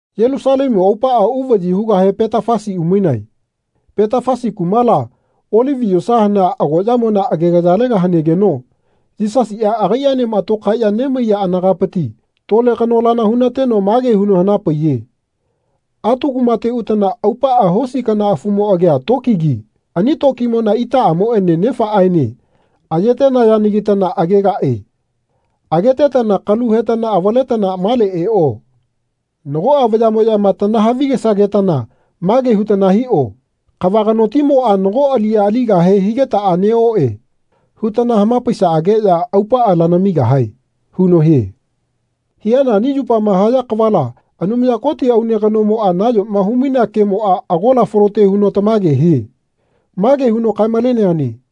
Yelusalemu aupaꞌa uvaꞌyi hugahe Petafasi umainae. Petafasi kumala Olivi yosa hanea agoꞌyamona agegayalega hanegeno Yisasiꞌa agaiꞌaenema tokaeꞌya nemaiya anagapiti tole kanolana hu-na-teno mage huno hana-paiye “Atu kumate utana aupaꞌa hosi kana afumo agia tokigi ani tokimona itaꞌamoꞌene nafaꞌneꞌaene aye-tenayanagitana agegaꞌe. Agetetana kalu hetana avaletana male eꞌo. Nagoꞌa vayaꞌmoꞌyama tanahavi-gesagetana mage hutana hiꞌo ‘Kava kanotimoꞌa nago aliꞌya aligahe higetaꞌa neꞌoꞌe.’ hutana hama-paisaꞌageꞌya aupaꞌa lanamigahae.” huno hie. Hiana ani yupama haya kavala Anumaya Koti aune kanomoꞌa nayoma hu-mainea kemoꞌa agola falote huno tamage hie. Mage huno kae-maleneane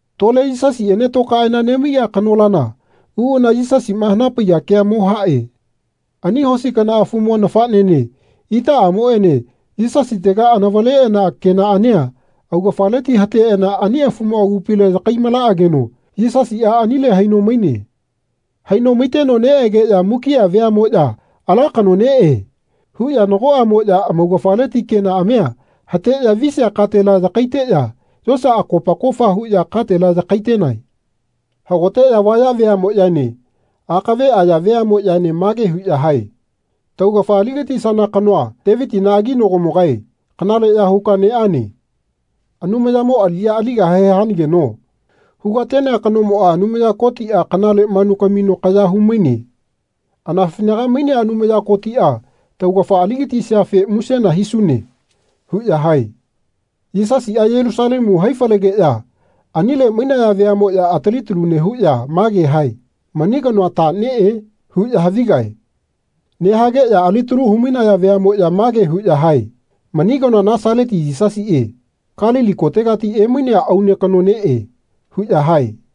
Tole Yisasiꞌene tokaeꞌana nemaiꞌa kanolana uꞌana Yisasiꞌma hana-paiya kea mo haꞌe. Ani hosi kana afumo nafaꞌnene itaꞌamoꞌene Yisasitega anavaleꞌana kenaꞌania anaugafaleti hateꞌana ani afumo agupile yakai-malaꞌageno Yisasiꞌa anile haino maine. Haino maiteno neꞌegeꞌya mukiꞌa veaꞌmoꞌya “Ala kano neꞌe.” huꞌya nagoꞌamoꞌya amaugafaleti kenaꞌamia hateꞌya visia katela yakaiteꞌya yosa akopa kofa huꞌya katela yakai-tenae. Hagoteꞌya vaya veaꞌmoꞌyaene akave aya veaꞌmoꞌyaene mage huꞌya hae “Taugafa ali-gatisana kanoa Teviti aginagomogae kanale ya huka neꞌane. Anumayamo aliꞌya aligahe hanageno hu-ga-tenea kanoa Anumaya Kotiꞌa kanale manu kamino kaya hu-maine. Anafinaga mainea Anumaya Kotiꞌa taugafa ali-gatisiafe musena hisune.” huꞌya hae. Yisasiꞌa Yelusalemu hai-falegeꞌya anile mainaya veaꞌmoꞌya atali talu nehuꞌya mage hae “Mani kanoa ta neꞌe?” huꞌya havigae. Nehageꞌya alitalu hu-mainaya veaꞌmoꞌya mage huꞌya hae “Mani kanoa Nasaleti Yisasiꞌe Kalili kotegati emainea aune kano neꞌe.” huꞌya hae.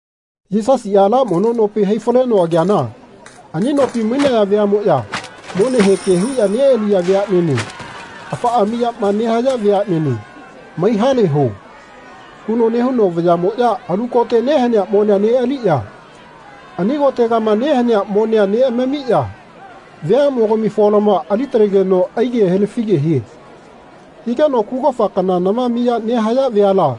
Yisasiꞌa ala mono nopi hai-faleno ageana ani nopi mainaya veaꞌmoꞌya monehe ke huꞌya neꞌaliya veaꞌnene afaꞌa miyama nehaya veaꞌnene “Mai haleho.” huno nehuno vayaꞌmoꞌya alu kote nehanea monea neꞌaliꞌya ani kotegama nehanea monea neꞌamamiya veaꞌmogami folamoa ali-talegeno aige helafige hie. Higeno kugofa kana nama miya nehaya veala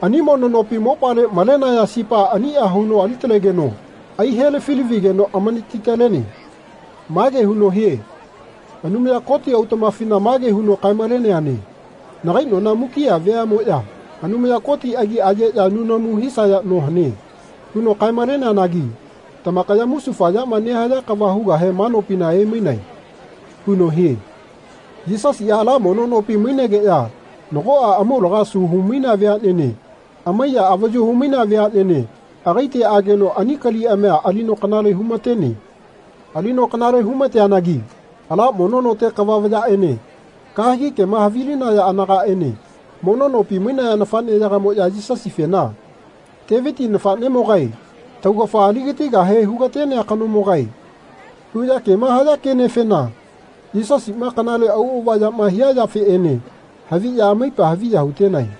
ani mono nopi mopale mainaya sipa aniꞌa huno ali-talegeno ai-helafi-lavigeno amanati-tale-tene. Mage huno hie “Anumaya Koti autaꞌmafina mage huno kae-maleneane ‘Nagai nona mukiꞌa veaꞌmoꞌya Anumaya Koti agi ayeꞌya nunamu hisaya no hane.’ huno kae-maleneanagi tamakaya musufa yama nehaya kava hugahe ma nopina emainae.” huno hie. Yisasiꞌa ala mono nopi mainegeꞌya nagoꞌa amaulaga asu hu-mainea veaꞌnene amaiya avayu hu-mainea veaꞌnene agaite ageno ani kaliꞌamia alino kanale hu-ma-tene. Alino kanale hu-ma-teanagi ala mono note kava vayaꞌene kahegi kema havilinaya anagaꞌene mono nopi mainaya nafaꞌneyagamoꞌya Yisasifena “Teviti nafaꞌnemogae, taugafa ali-gatigahe hu-ga-tenea kanomogae.” huꞌya kema haya kenefena Yisasiꞌma kanale auꞌava yama hia yafeꞌene haviꞌya amaipa haviya hu-tenae.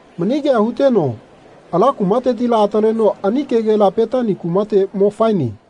Mani kea huteno ala kumatetila ataleno ani kegela Petani kumate mo faene.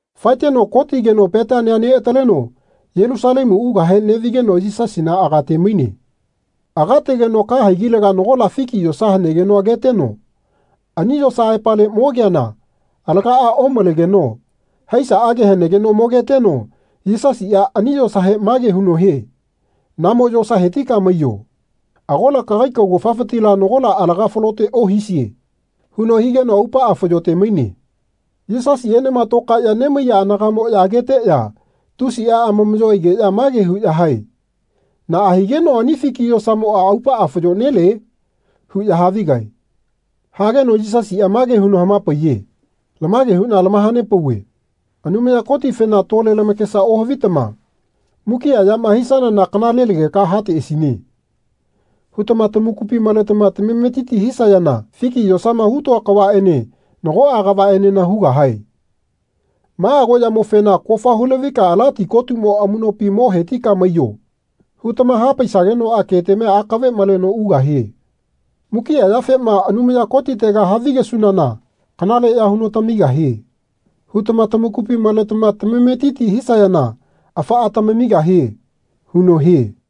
Faeteno kotigeno Petania neꞌataleno Yelusalemu ugahe neꞌvigeno Yisasina aga-te-maine. Aga-tegeno ka haigilega nagola fiki yosa hanegeno ageteno ani yosa aepale mogeana alagaꞌa omalegeno haisaꞌage hanegeno mogeteno Yisasiꞌa ani yosahe mage huno hie “Namo yosa hetika maiyo. Agola kagai kaugafafitila nagola alaga falote ohisie.” huno higeno aupaꞌa fayo-te-maine. Yisasiꞌaenema tokaeꞌya nemaiya anagaꞌmoꞌya ageteꞌya tusiꞌa amamaꞌyo aigeꞌya mage huꞌya hae “Naꞌa higeno ani fiki yosamoꞌa aupaꞌa fayo-nelie?” huꞌya havigae. Hageno Yisasiꞌa mage huno hama-paiye “Lamage huꞌna tamaha-nepauve Anumaya Kotifena tole lamakesa ohavitama ‘Mukiꞌa yama hisanana kanalelageka hateꞌasine.’ hutama tamakupi maletama tametiti hisayana fiki yosama hu-toa kavaꞌene nagoꞌa kavaꞌenena hugahae. Ma agoꞌyamofena ‘Kofa hu-lavika ala ti kotumo amuꞌnopi mo hetika maiyo.’ hutama hapaisagenoꞌa ketamia akave maleno ugahie. Mukiꞌa yafema ‘Anumaya Kotitega havigesunana kanaleꞌya huno tamigahie.’ hutama tamakupi maletama tamametiti hisayana afaꞌa amamigahie.” huno hie.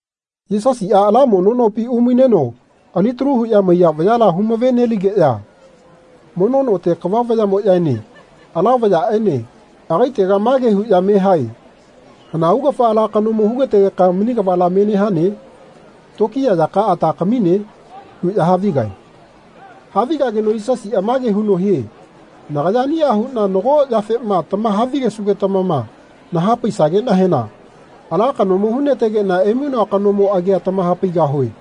Yisasiꞌa ala mono nopi umaineno alitalu huꞌya maiya vayala hu-mave-neligeꞌya mono note kava vayaꞌmoꞌyaene ala vayaꞌene agaitega mage huꞌya me hae “Hana augafa ala kanomo hu-gategeka mani kavala menehane? Tokiya yakaꞌa ta kamine?” huꞌya havigae. Havigageno Yisasiꞌa mage huno hie “Nagaya aniꞌa huꞌna nago yafema tamaha-vigesugetamama naha-paisageꞌnahena ala kanomo hu-na-tegeꞌna emainoa kanomo agia tamaha-paigahue.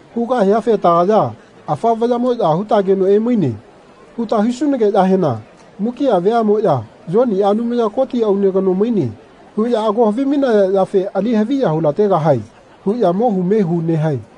Hugahiafe tagaya “Afa vayaꞌmoꞌya hutageno emaine.” huta hisunageꞌyahena mukiꞌa veaꞌmoꞌya “Yoniꞌa Anumaya Koti aune kano maine.” huꞌya ago havimainaya yafe ali haviya hu-la-tegahae huꞌya mohu mehu nehae.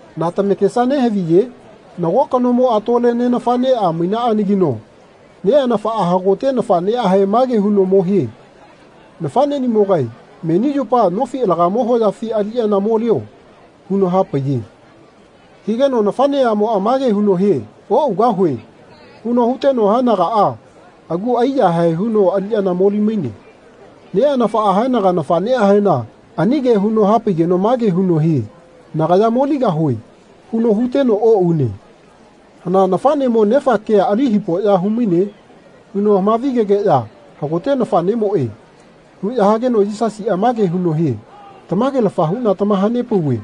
Na tamakesa nehaviye? Nago kanomoꞌa tole neꞌnafaꞌneꞌa mainaꞌanagino neꞌanafaꞌa hagote nafaꞌneꞌahe mage huno mo hie “Nafaꞌneꞌnimogae meni yupa nofi alagamo hoyafi aliꞌyana molio.” huno hapaiye. Higeno nafaꞌneꞌamoꞌa mage huno hie “Oꞌugahue.” huno huteno haenagaꞌa agu ai-yahae huno aliꞌyana moli-maine. Neꞌanafaꞌa haenaga nafaꞌneꞌahena ani ke huno hapaigeno mage huno hie “Nagaya moligahue.” huno huteno oꞌune. Hana nafaꞌnemo nefa kea ali hipoꞌya hu-maine? huno hama-vi-gegeꞌya “Hagote nafaꞌnemoꞌe.” huꞌya hageno Yisasiꞌa mage huno hie “Tamage-lafa huꞌna tamaha-nepauve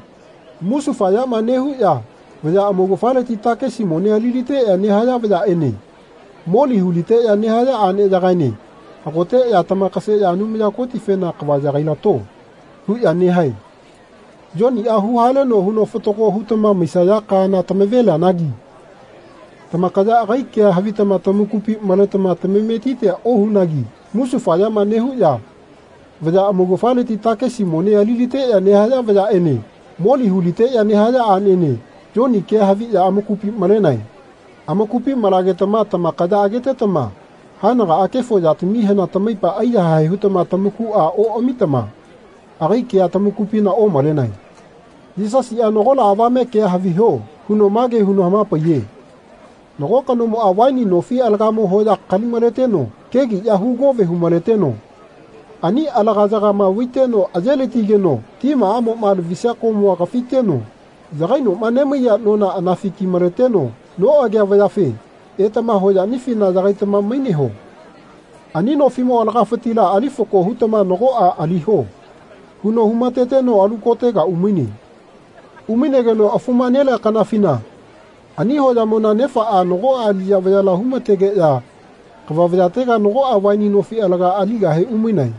musufayama nehuꞌya vaya amaugafaleti takesi mone ali-liteꞌya nehaya vayaꞌene moli hu-liteꞌya nehaya aꞌneyagaene hagoteꞌya tamakaseꞌya Anumaya Kotifena ‘Kava yagai-lato.’ huꞌya nehae. Yoniꞌa hu-haleno huno fatago hutama maisaya kaana tamave-lianagi tamakaya agai kea havitama tamakupi maletama tamametitia ohunagi musufayama nehuꞌya vaya amaugafaleti takisi mone ali-liteꞌya nehaya vayaꞌene moli hu-liteꞌya nehaya aꞌnene Yoni kea haviꞌya amakupina malenae. Amakupi malagetama tamakaya agetetama haenagaꞌa kefo yatamihena tamaipa aiyahae hutama tamakuꞌa oꞌamitama agai kea tamakupina omalenae.” Yisasiꞌa “Nagola avame kea haviho.” huno mage huno hama-paiye Nago kanomoꞌa vaini nofi alagamo hoya kali-maleteno kegiꞌya hu-gove hu-maleteno ani alagayagama vaiteno aye-latigeno timaꞌamoꞌma lavisia komua kafiteno yagainoꞌma nemaiya nona anafi ki-maleteno noꞌagea vayafe “Etama hoyaꞌnifina yagaitama maineho. Ani nofiꞌmo alagafitila ali fako hutama nagoꞌa aliho.” huno hu-ma-teteno alu kotega umaine. Umainegeno afuma nelea kanafina ani hoyamona nefaꞌa nagoꞌa aliꞌya vayala hu-ma-tegeꞌya kava vayatega nagoꞌa vaini nofi alaga aligahe umainae.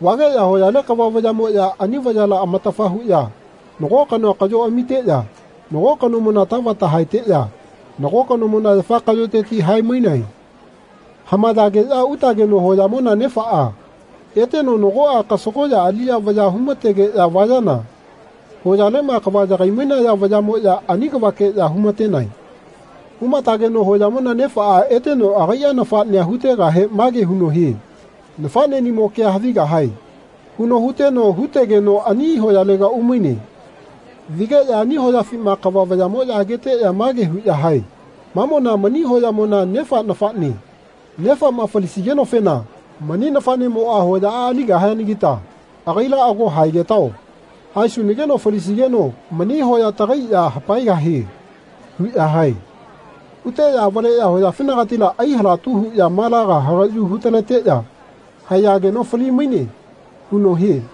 Vageꞌya hoyale kava vayaꞌmoꞌya ani vayala amatafa huꞌya nago kanoa kaꞌyo amiteꞌya nago kanomona tavata haeteꞌya nago kanomona yafa kaꞌyoteti hae-mainae. Hamayageꞌya utageno hoyamona nefaꞌa eteno nagoꞌa kasagoꞌya aliꞌya vayaꞌa hu-ma-tegeꞌya vayana hoyaleꞌma kava yagai-mainaya vayaꞌmoꞌya ani kavakeꞌya hu-ma-tenae. Hu-ma-tageno hoyamona nefaꞌa eteno agaiꞌa nafaꞌnea hu-tegahe mage huno hie “Nafaꞌneꞌnimo kea havigahae.” huno hu-teno hu-tegeno ani hoyalega umaine. Vigeꞌya ani hoyafima kava vayaꞌmoꞌya ageteꞌya mage huꞌya hae “Mamona mani hoyamona nefa nafaꞌne. Nefaꞌma falisigenofena mani nafaꞌnemoꞌa hoyaꞌa aligahianagita agaila ago haegetao. Haesunageno falisigeno mani hoya tagai ya hapaegahie.” huꞌya hae. Huteꞌya avaleꞌya hoyafinagatila ai-halatu huꞌya malaga hagaꞌyu hu-taleteꞌya haeyageno fali-maine huno hie.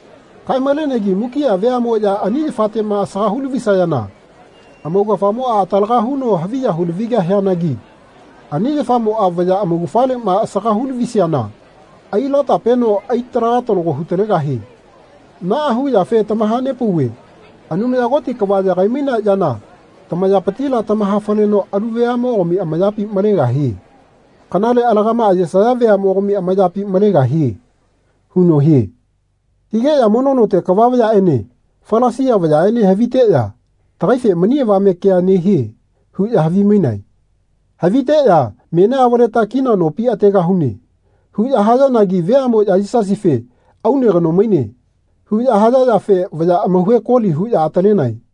Kae-malenegi mukiꞌa veamoꞌya ani yafateꞌma asaga hu-lavisayana amaugafamoꞌa atalaga huno haviya hu-lavigahianagi ani yafamoꞌa vaya amaugafaleꞌma asaga hu-lavisiana ai-latapeno ai-talaga talago hu-talegahie. Naꞌa huyafe tamaha-nepauve Anumaya Koti kava yagai-mainea yana tamayapitila tamaha-faleno alu veaꞌmogami amayapi malegahie. Kanale alagaꞌma ayesaya veaꞌmogami amayapi malegahie huno hie. Higeꞌya mono note kava vayaꞌene Falasia vayaꞌene haviteꞌya “Tagaife mani avame kea nehie.” huꞌya havimainae. Haviteꞌya “Menia avaleta kina nopi ategahune.” huꞌya hayanagi veaꞌmoꞌya Yisasife “Aune kano maine.” huꞌya haya yafe vaya amauhe koli huꞌya atalenae.